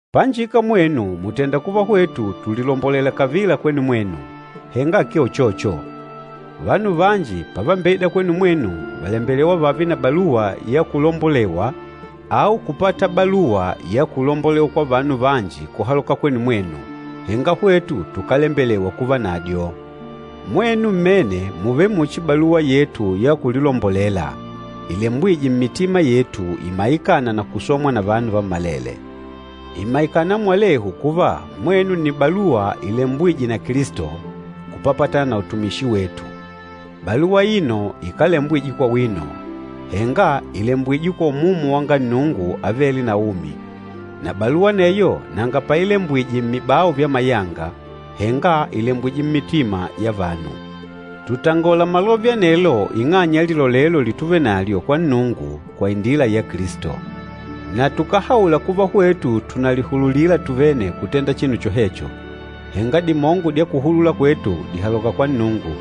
Panjika mwenu mùtenda kuva hwetu tùlilombolela kavila kwenu mwenu, henga akee uchocho. Vanu vanji pavambeida kwenu mwenu vàlembelewa vààve na baluwa ya kulombolewa au kupata baluwa ya kulombolewa kwa vanu vanji kuhaloka kwenu mwenu, henga hwetu tukálembelewa kuvanadyo. Mwenu mmene mùvele muchi baluwa yetu ya kulilombolela, ilembwîje mmitima yetu imaikâna na kusomwa na vanu vammalele. Ìmaikana mwalehu kuva mwenu nni baluwa ilembwîje na Kilisto, kupapatana na utumishi wetu. Baluwa aino ikálembwije kwa wino, henga ìlembwije kwa Umumu wanga Nnungu avêle na umi. Na baluwa aneyo nanga pailembwije mmibao vya mayanga, henga ìlembwije mmitima ya vanu. Tùtangola malove anelo ing'anya ya lilolelo lituvenalyo kwa Nnungu kwa indila ya Kilisto. Na tukáhaula kuva hwetu tùnalihululila tuvene kutenda chinu chohecho, henga dimongo dya kuhulula kwetu dìhaloka kwa Nnungu.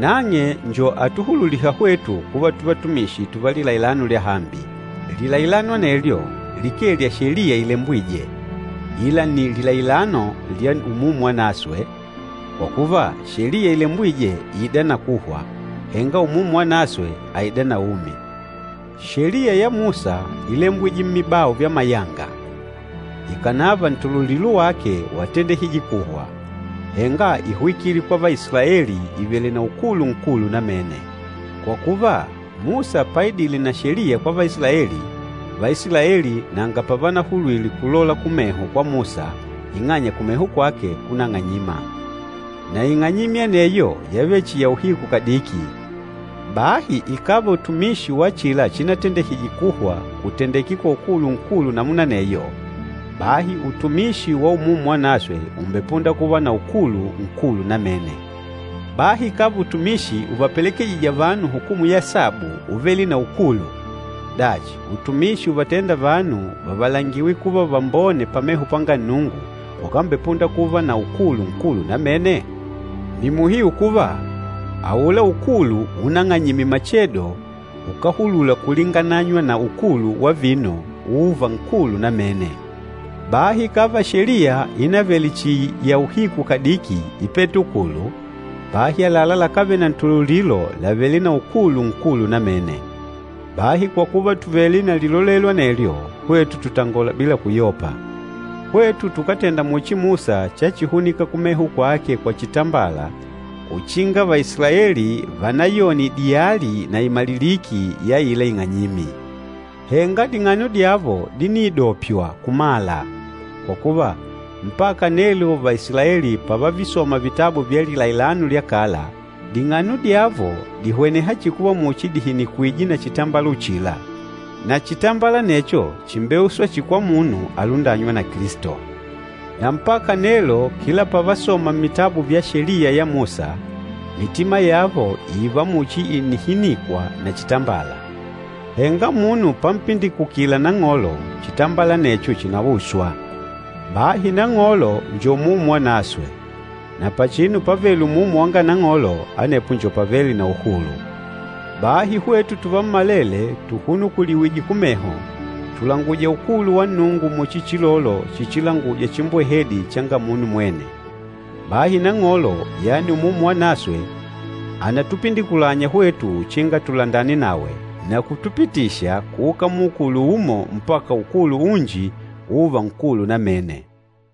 Nang'e njo atuhululîha hwetu kuva tuvatumishi tùvá lilailano lyahambi. Lilailano anelyo likee lya Sheliya ilembwîje, ila nni lilailano lya Umumu Wanaswe. Kwa kuva, Sheliya ilembwîje ìida na kuhwa, henga Umumu Wanaswe àida na umi. Sheliya ya Musa ílembwije mmibao vya mayanga. Ikànava ntululilo wake wátendihije kuhwa, henga íhwikile kwa Vaisilaeli ivèlè na ukulu nkulu namene. Kwa kuva, Musa páidile na Sheliya kwa Vaisilaeli, Vaisilaeli nanga pavanahulwile kulola kumeho kwa Musa ing'anya kumeho kwake kúnang'anyima. Na ing'anyimi aneyo yavele chihi ya uhiku kadiki. Bahi ikàva utumishi wa achila chinatendihije kuhwa kutendeke kwa ukulu nkulu namuna aneyo, bahi, utumishi wa Umumu Wanaswe ùmbepunda kuva na ukulu nkulu namene. Bahi ikàva utumishi uvapelekejîja vanu hukumu ya asabu úvele na ukulu, dachi utumishi uvatênda vanu vavalangiwe kuva vambone pameho panga Nnungu ukambepunda kuva na ukulu nkulu namene? Ni muhiu kuva, aula ukulu únang'anyime machedo ukáhulula kulingananywa na ukulu wa vino ûva nkulu namene. Bahi ikàva Sheliya ínavele chihi ya uhiku kadiki ípete ukulu, bahi àlalá lakávele na ntululilo làvele na ukulu nkulu namene. Bahi kwa kuva tùvele na lilolelo anelyo, hwetu tùtangola bila kuyopa. Hwetu tukátenda muchi Musa chachihunika kumeho kwake kwa chitambala uchinga Vaisilaeli vanayone idiyali na imaliliki ya aila ing'anyimi. Henga ding'ano dyavo díniidopywa kumala. Kwa kuva, mpaka nelo Vaisilaeli pavavisoma vitabu vya Lilailano lya Kala, ding'ano dyavo dìhweneha chihi kuva muchi dìhinikwije na chitambala uchila. Na chitambala anecho chìmbeuswa chihi kwa munu alundânywa na Kilisto. Na mpaka nelo, kila pavasoma mmitabu vya Sheliya ya Musa, mitima yavo ììva muchi ìnihinikwa na chitambala. Henga munu pampindikukila Nang'olo, chitambala anecho chìnauswa. Bahi “Nang'olo” njo Umumu Wanaswe, na pachinu pávèlè Umumu wanga Nang'olo, anepo njo pavêle na uhulu. Bahi hwetu tuvammalele tuhunukuliwîje kumeho, tùlanguja ukulu wa Nnungu muchi chilolo chìchilanguja chimbwehedi changa munu mwene. Bahi Nang'olo, yani Umumu Wanaswe ànatupindikulanya hwetu uchinga tulandane nawe, na kutupitisha kuuka muukulu umo mpaka ukulu unji ûva nkulu namene.